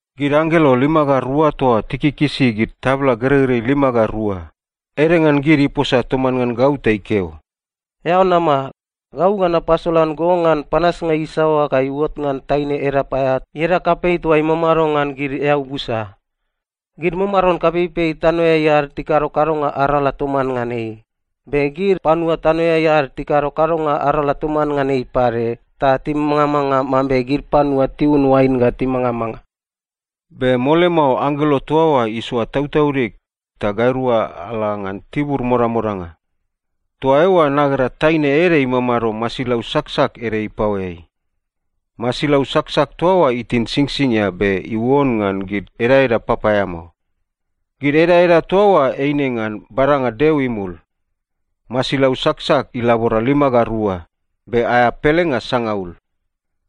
Gid anggelo lima ga rua toa tikikisi gid tabla gereirei lima ga rua, ede ngan gid iposa toman ngan gau ta ikeo, “Eao nama. Gau ga napasolan go ngan panasnga isaoa ga iuot ngan taine edap aea ieda kapei toa imamado ngan gid eau busa. Gid mamaron kapeipei tanoeai ad tikado kadonga arala toman ngan ei, be gid panua tanoeai ad tikado kadonga arala toman ngan ei pade ta timangamanga mambe gid panua tiun oain ga timangamanga.” Be mole mao anggelo toa oa isoa tautaudig, ta gairua ala ngan tibur modamodanga. Toa eoa nagera taine ede imamado masilau saksak ede ipaoeai. Masilau saksak toa oa itin singsingia be iuon ngan gid edaeda papaeamao. Gid edaeda toa oa eine ngan badanga Deo imul. Masilau saksak ilabora lima ga rua, be aea pelenga sangaul.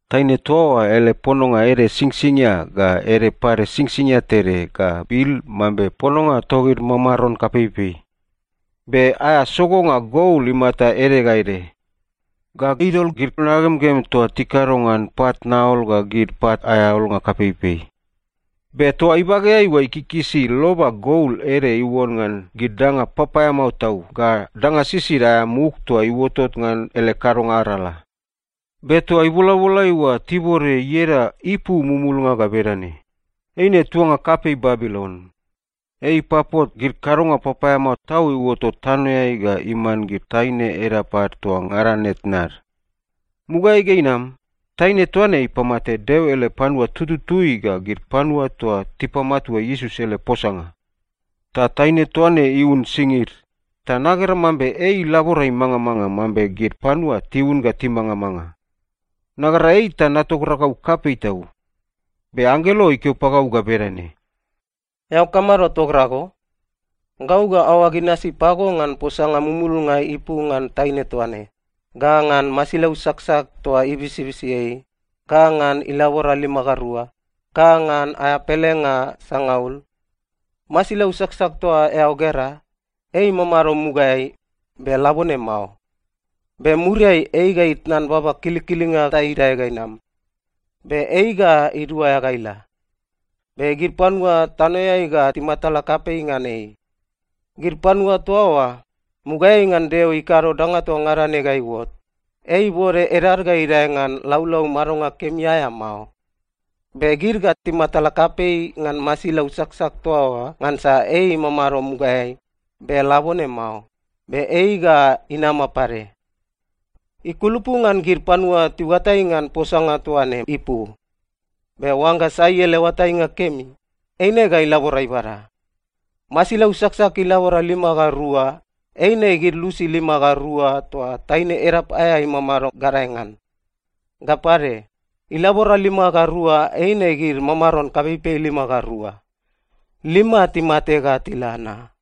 Taine toa oa ele pononga ede singsingia ga ede pade singsingia tede ga bil mambe pononga togid mamaron kapeipei. Be aea sogonga gol imata ede ga ede. Ga idol gid nagemgem toa tikado ngan pat naol ga gid pat aea olnga kapeipei. Be toa ibageai oa ikikisi loba gol ede iuon ngan gid danga papaeamao tau ga danga sisid aea muk toa iuotot ngan ele kadonga arala. Be toa ibolabolai oa tibode ieda ipu mumulnga ga bedane: Eine tuanga kapei Babilon. Ei ipapot gid kadonga papaeamao tau iuotot tanoeai ga iman gid taine edap ad toa ngada ne tnad. Mugaeai ga inam, taine toa ne ipamate Deo ele panua tututui ga gid panua toa tipamatua Iesus ele posanga. Ta taine toa ne iun singid, ta nagera mambe ei ilabora imangamanga mambe gid panua tiun ga timangamanga. Nagera ei ta natogragau kapei tau. Be anggelo ikeo pagau ga bedane, “Eao kamado togrago? Gau ga aoag inasi pago ngan posanga mumulnga ipu ngan taine toa ne, ga ngan masilau saksak toa ibisibisi ei, ga ngan ilabora lima ga rua, ga ngan aea pelenga sangaul. Masilau saksak toa eao gera, ei imamado mugaeai, be labone mao. Be muriai ei ga itnan baba kilikilinga ta idae ga inam. Be ei ga iduaea ga ila. Be gid panua tanoeai ga timatala kapei ngan ei. Gid panua toa oa, mugaeai ngan Deo ikado danga toa ngada ne ga iuot, ei ibode edad ga idae ngan laulau madonga kemi aea mao. Be gid ga timatala kapei ngan masilau saksak toa oa ngansa ei imamado mugaeai, be labone mao, be ei ga inama pade. “Ikulupu ngan gid panua tiuatai ngan posanga toa ne ipu. Be oangga sai ele oatainga kemi, eine ga ilabora ibada. Masilau saksak ilabora lima ga rua eine gid lusi lima ga rua toa taine edap aea imamado gadae ngan. Ga pade, ilabora lima ga rua eine gid mamaron kapeipei lima ga rua. Lima timate ga tila na.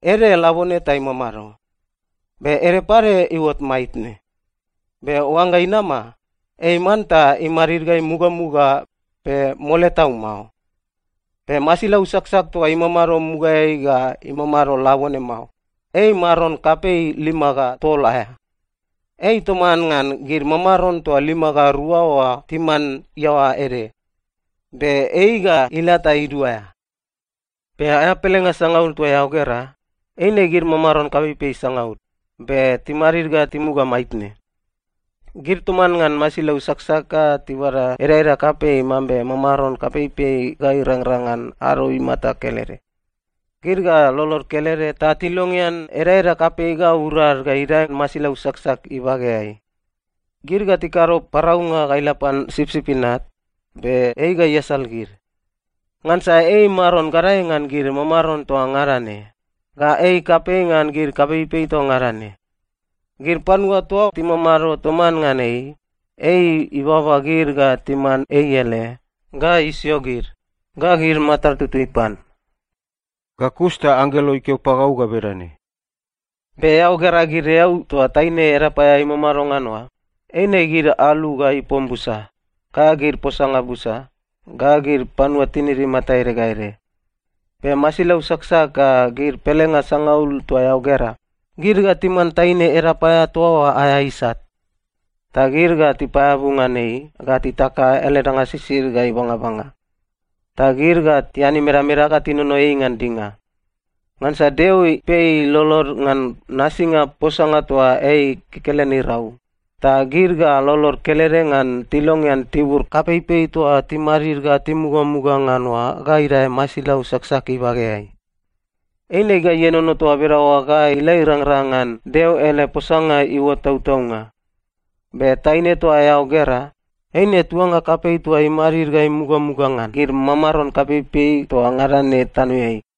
Ede labone ta imamado. Be ede pade iuot maitne. Be oangga inama, ei manta imadid ga imugamuga, be mole tau mao. Be masilau saksak toa imamado mugaeai ga imamado labone mao, ei maron kapei lima ga tol aea. Ei toman ngan gid mamaron toa lima ga rua oa timan iaoa ede. Be ei ga ila ta iduaea. “Be aea pelenga sangaul toa eao gera, eine gid mamaron kapeipei sangaul, be timadid ga timuga maitne. Gid toman ngan masilau saksak ga tibada edaeda kapei mambe mamaron kapeipei ga irangrang ngan ado imata kelede. Gid ga lolod kelede ta tilongean edaeda kapei ga urad ga idae masilau saksak ibageai. Gid ga tikado paraunga ga ila pan Sipsip Inat, be ei ga iasal gid. Ngansa ei Maron gadae ngan gid mamaron toa ngada ne, ga ei kapei ngan gid kapeipei toa ngada ne. Gid panua toa timamado toman ngan ei, ei ibaba gid ga timan ei ele, ga isio gid, ga gid matad tutui pan.” Ga kus ta anggelo ikeo pagau ga bedane, “Be eao gera gid eau toa taine edap aea imamado ngan oa, eine gid alu ga ipom busa, ga gid posanga busa, ga gid panua tinid imata ede ga ede. Be masilau saksak ga gid pelenga sangaul toa eao gera, gid ga timan taine edap aea toa oa aea isat. Ta gid ga tipaeabu ngan ei ga titaka ele danga sisid ga ibangabanga. Ta gid ga tian imedameda ga tinono ei ngan dinga. Ngansa Deo ipei lolod ngan nasinga posanga toa ei kekelen irau, ta gid ga lolod kelede ngan tilongean tibur kapeipei toa timadid ga timugamuga ngan oa ga idae masilau saksak ibageai. Eine ga ienono toa bedaoa ga ila irangrang ngan Deo ele posanga iuot tautaunga. Be taine toa eao gera, eine tuanga kapei toa imadid ga imugamuga ngan gid mamaron kapeipei toa ngada ne tanoeai.”